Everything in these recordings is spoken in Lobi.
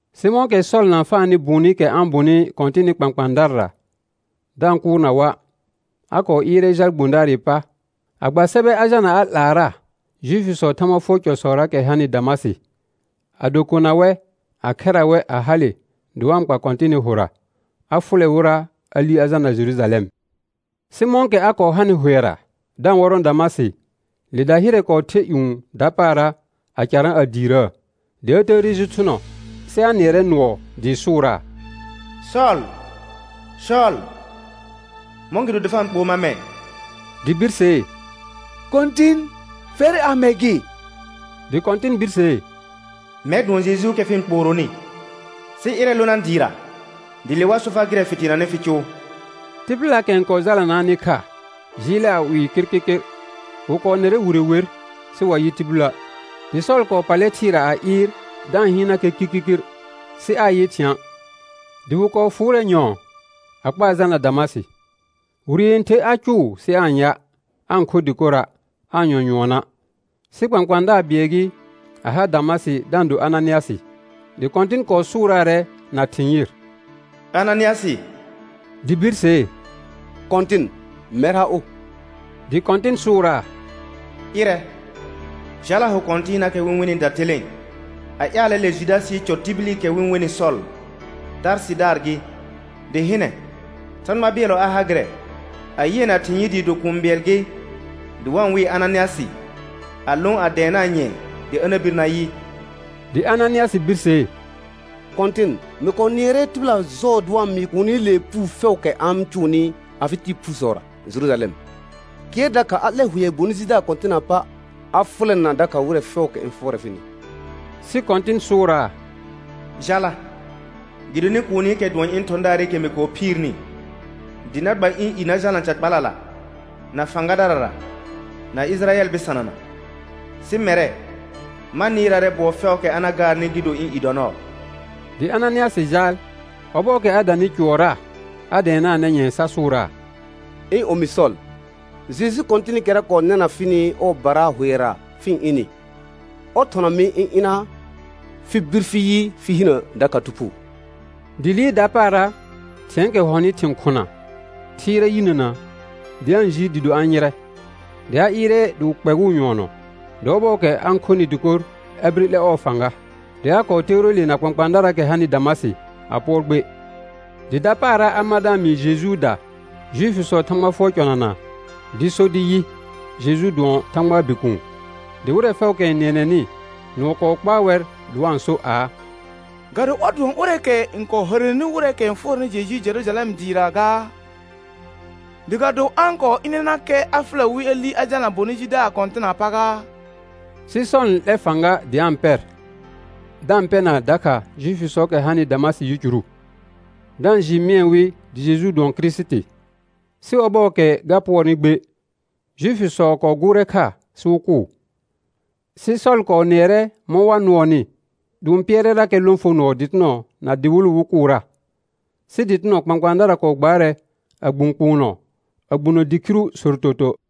Sɩ mɔ̃kɛ Sɔl na-n faanɩ bʋʋnɩkɛ a-n bʋnɩ Kɔ̃tɩnɩ kpãkpãadarara da-n kʋʋrna wa', a kɔɔ ɩɩrɛ jal gbõdaarɩ pa a gba sɛbɛ a jalna a 'laara Juifisɔɔ Thãgba fʋɔr cɔsɔraakɛ hanɩ Damasɩ, ado kona wɛ, a khɛra wɛ, a hale dɩ wa-n kpa Kɔ̃tɩnɩ hʋra, a fʋlɛ wɩra a li a jalna Jerujalɛm. Sɩ mɔ̃kɛ a kɔɔ hanɩ hʋɛra da-n wɔrɔ̃ Damasɩ, le dahɩrɛ kɔɔ the ƴũ dapaara, a carã a diirəə. Dɩ a təəre ji thʋnɔ, sɩ a nɩɛrɛ nʋɔ dɩɩ sʋʋraa: Sɔl, Sɔl, mɔ̃gɩdo dɩ fa-n kpoo mar mɛ̃? Dɩ birsee: Kɔ̃tɩn, fɛr amɛ gɩ? Dɩ Kɔ̃tɩn birsee: Mɛr dʋɔn Jejuukɛ fɩ-n kpooronɩ. Sɩ ɩrɛ lona dɩɩra, dɩ le wa so far gɩrɛ fɩ teenanɩ fɩ cʋʋ. Tɩbɩlaakɛ n kɔɔ jalanaanɩ kha jɩɩlɛ a 'wɩɩ kɩrkɩrkɩr, wɩ kɔɔ nɩrɛ wire wer, sɩ wa yɩ tibilə'. Dɩ Sɔl kɔɔ pallɛ thɩɩra a ɩɩr da-n hɩɩnnakɛ kirkirkir sɩ aa-n yɩ thɩ̃a', dɩ wɩ kɔɔ fʋʋrɛ nyɔ̃ɔ a kpaa jalna Damasɩ. Wire yẽther a cʋʋ sɩ aa-n ya', aa-n kho dɩkora', aa-n yɔ nyʋɔna'. Sɩ kpãkpãadaar bɩɛl gɩ a ha Damasɩ da-n do Ananɩasɩ. Dɩ Kɔ̃tɩn kɔɔ sʋʋraarɛ na thɩ̃ yɩr: Ananɩasɩ. Dɩ birsee: Kɔ̃tɩn, mɛr ha ʋ; dɩ Kɔ̃tɩn sʋʋraa: Ɩrɛ, jala hʋ kɔ̃tɩɩnaakɛ wɩ-n wenɩ datelẽe a ƴaalɛ le Judasɩɩ cɔ tibilikɛ wɩ-n wenɩ Sɔl, Tarsɩdaar gɩ. Dɩ hɩnɛ, Thãgba bɩɛllɔ a ha gɩrɛ, a yɩɛ na ɩhĩ yɩɩ dɩɩ do kũu bɩɛl gɩ dɩ wa-n wɩɩ Ananɩasɩ, a lõ a dɛɛnaa nyɛ̃ɛ dɩ a na bir na yɩ. Dɩ Ananɩasɩ birsee: Kɔ̃tɩn, mɩ kɔɔ nɩɛrɛ tɩbɩla jɔɔ dɩ wa-n mɩɩ kuunilee puu fɛʋʋkɛ a-n cʋʋnɩ afɩ ɩɩɩ phusɔra Jerujalɛm; kɩɛr dakha a 'lɛr hʋɛ bonɩ jidaar kɔ̃tɩnaa pa, a fʋlɛna dakha wɩrɛ fɛʋʋkɛ n fʋɔrɛ fɩnɩ. Sɩ Kɔ̃tɩn sʋʋraa: Jala, gɩdonɩ kuunikɛ dʋɔn ɩ̃ thɔ̃daarɩkɛ mɩ phiirni dɩ na gba ɩ̃ i na jalna ca kpalala, na fãgadarara, na Ɩjɩrayɛl bɩsanana; sɩ mɛrɛ, ma nɩɩraarɛ bʋɔ fɛʋʋkɛ a na gaarnɩ, gɩ do ɩ̃ i dɔ nɔɔ. Dɩ Ananɩasɩ jaal. Ɔbɔɔkɛ a danɩ cʋɔrra a dɛɛnaanɛ nyɛ̃ɛ sa sʋʋraa: Ɩ̃ omi Sɔl, Jeju Kɔ̃tɩnɩkɛra kɔɔ nɛna fɩnɩ ɔɔbara hʋɛra fɩ-n ɩnɩ, ɔr thɔna mɩ ɩ̃ ɩna, fɩ bir fɩ yɩ fɩ hinə dakha Thu Phuu. Dɩ liir dapaara thɩ̃ɛɛkɛ hɔnɩ thɩ̃ khʋna thɩɩrɛ yinəna, dɩ a-n jiir dɩɩ do a-n yɩrɛ. Dɩ a ɩɩrɛ dɩ wɩ kpɛgʋʋ nyʋɔnɔ; dɩ ɔbɔɔkɛ a-n khonɩ dɩkor a bire 'lɛ ɔɔ fãga. Dɩ a kɔɔ toore le na kpãkpãadaraakɛ hanɩ Damasɩ a pʋɔr gbe. Dɩ dapaara a mar da-n mɩɩ Jejuuda Juifisɔɔ Thãgba fʋɔr cɔnana dɩ so dɩ yɩ: Jeju dʋɔn Thãgbaa Bikuun. Dɩ wɩrɛ fɛʋʋkɛ n nɩɛnɛnɩ, nʋɔ kɔɔ kpaa wɛr dɩ wa-n so aa: Ga do ɔr dʋɔn ʋrɛɛkɛ n kɔɔ hərəneni wɩrɛɛkɛ n fʋɔrɛnɩ Jeju Jerujalɛm dɩɩra gaa? Dɩ ga do a-n kɔɔ ɩnɛnakɛ a fʋlɛ wɩ a li a jalna bonɩ jidaar kɔ̃tɩnaa pa gaa? Sɩ Sɔl n 'lɛr fãga dɩ a-n pɛr, da-n pɛna dakha Juifisɔɔkɛ hanɩ Damasɩ yicuru, da-n jɩɩ mɩɛ wɩ dɩ Jeju dʋɔn Kirisiti. Sɩ ɔbɔɔkɛ ga pʋɔrnɩ gbe, Juifisɔ kɔɔ gʋʋrɛ kha sɩ wɩ kʋʋ. Sɩ Sɔl kɔɔ nɩɛrɛ mɔ̃ wa nʋɔnɩ, dɩ wɩ-n pɩɛrɛrakɛ lõfonɔɔ dɩtɩnɔ na dɩwɩlʋ wɩ kʋʋra. Sɩ dɩtɩnɔ kpãkpãadara kɔɔ gbaarɛ a gbũ kpʋʋnɔ, a gbunə dɩ khiru sortoto.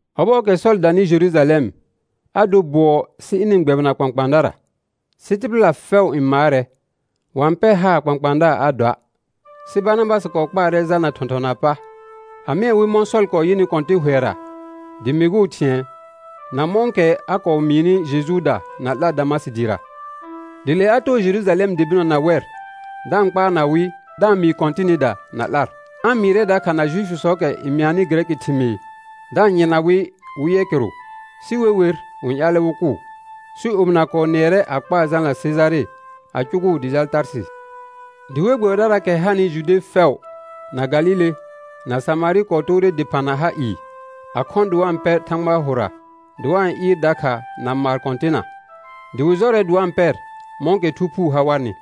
Ɔbɔɔkɛ Sɔl danɩ Jerujalɛm, a dor bʋɔ sɩ ɩnɩ-n gbɛbɩna kpãkpãadara; sɩ tɩbɩla fɛʋ n maarɛ, wa-n pɛr haar kpãkpãadaar a doa'. Sɩ Barnabasɩ kɔɔ kpaarɛ jalna thɔ̃thɔnaa pa, a mɩɛ wɩ mɔ̃ Sɔl kɔɔ yɩnɩ Kɔ̃tɩn hʋɛra dɩ mɩgʋʋ thɩ̃ɛ, na mɔ̃kɛ a kɔɔ mɩɩnɩ Jejuuda na 'lar Damasɩ dɩɩra. Dɩ le a too Jerujalɛm dɩ bɩnɔ na wɛr da-n kpaarna wɩ da-n mɩɩ Kɔ̃tɩnɩda na 'lar. A-n mɩɩrɛ dakha na Juifisɔɔkɛ n mɩanɩ gɩrɛkɩ thɩmɩɩr da-n yɩrna wɩ wɩ yɛ kɩrʋ, sɩ we wer, wɩ-n ƴaalɛ wɩ kʋʋ. Sɩ omɩna kɔɔ nɩɛrɛ a kpaa jalna Sejare a cʋgʋʋ dɩ jal Tarsɩ. Dɩ we gbɛbɩdaraakɛ hanɩ Jude fɛʋ, na Galile, na Samarɩ kɔɔ toore dɩphã na ha ɩɩ, a khɔ̃ dɩ wa-n pɛr Thãgbaa hʋra, dɩ wa-n ɩɩr dakha na maar Kɔ̃tɩnna, dɩ wɩ jɔrɛ dɩ wa-n pɛr mɔ̃kɛ Thu Phuu ha warnɩ.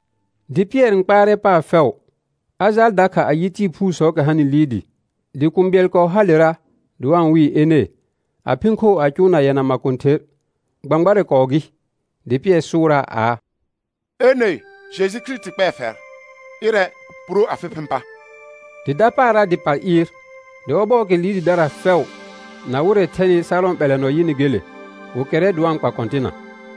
Dɩ Pɩɛr n kpaarɛ paar fɛʋ; a jaal dakha a yɩ tɩɩ phuusɔɔkɛ hanɩ Lɩɩdɩ. Dɩ kũu bɩɛl kɔɔ halera dɩ wa-n wɩɩ Ene, a phɩ̃ khoo a cʋʋna yɛna makõther, gbãgbarɛ kɔɔ gɩ. Dɩ Pɩɛr sʋʋraa aa: Ene, Jeju Kirisiti kpɛɛ fɛr, ɩrɛ, puro afɩ phɩ̃ pa. Dɩ dapaara dɩ pal ɩɩr. Dɩ ɔbɔɔkɛ Lɩɩdɩdara fɛʋ na wɩrɛ thɛnɩ Sarɔ̃ ɓɛlɛnɔ yɩnɩ gele, wɩ kɛrrɛ dɩ wa-n kpa Kɔ̃tɩnna.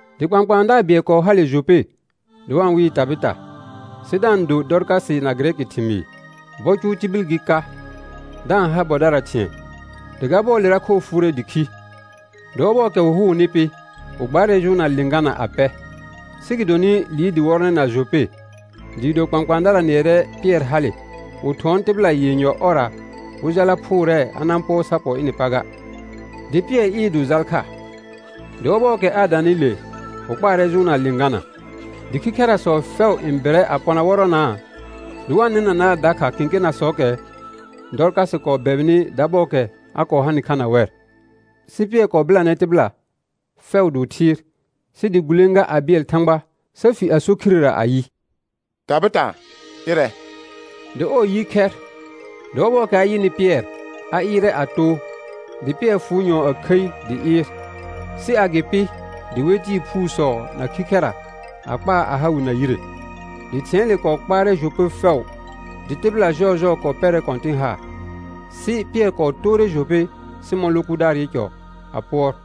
Dɩ kpãkpãadaar bɩɛl kɔɔ hale Jope dɩ wa-n wɩɩ Tabɩta, sɩ da-n do Dɔrkasɩ na gɩrɛkɩ thɩmɩɩr; bɔ cʋʋ tibil gɩ ka, da-n ha bɔdara thɩ̃ɛ. Dɩ ga bɔɔlera khoo fʋʋrɛ dɩ khi. Dɩ ɔbɔɔkɛ wɩ hʋʋnɩ pɩ, wɩ gbaarɛ jʋʋnna lɩ̃gana a pɛ. Sɩ gɩdonɩ Lɩɩdɩ wɔrɔnɛ na Jope, dɩɩ do kpãkpãadara nɩɛrɛ Pɩɛr hale, wɩ thʋɔn tɩbɩla yenyɔ ɔrra wɩ jala phʋʋrɛɛ a na-n pʋɔr sa pɔ ɩnɩ pa ga. Dɩ Pɩɛr ɩɩr dɩ wɩ jal kha. Dɩ ɔbɔɔkɛ a danɩ le, wɩ kpaarɛ jʋʋnna lɩ̃gana. Dɩ khikhɛrasɔ fɛʋ n bɩrɛ a pɔna wɔrɔnaa, dɩ wa-n nɩnanaa dakha kẽkenasɔɔkɛ Dɔrkasɩ kɔɔ bɛbɩnɩ dabɔɔkɛ a kɔɔ hanɩ kha na wɛr. Sɩ Pɩɛr kɔɔ bɩlanɛ tɩbɩla fɛʋ dɩ wɩ thɩɩr, sɩ dɩ gulẽga a bɩɛl Thãgba sa fi a so khirera ayɩ: Tabɩta, ɩrɛ. Dɩ ɔɔ yɩ khɛr, dɩ ɔbɔɔkɛ a yɩnɩ Pɩɛr a ɩɩrɛ a too. Dɩ Pɩɛr fʋʋ nyɔ̃ɔ a khəi dɩ ɩɩr, sɩ agɩpɩ dɩ we tɩɩ phuusɔ na khikhɛra a kpaa a ha wɩ na yire. Dɩ thɩ̃ɛɛle kɔɔ kpaarɛ Jope fɛʋ dɩ tɩbɩla jɔɔjɔɔ kɔɔ pɛrɛ Kɔ̃tɩn haar. Sɩ Pɩɛr kɔɔ toore Jope Sɩmɔ̃ lo kʋdaarɩ cɔ a pʋɔr.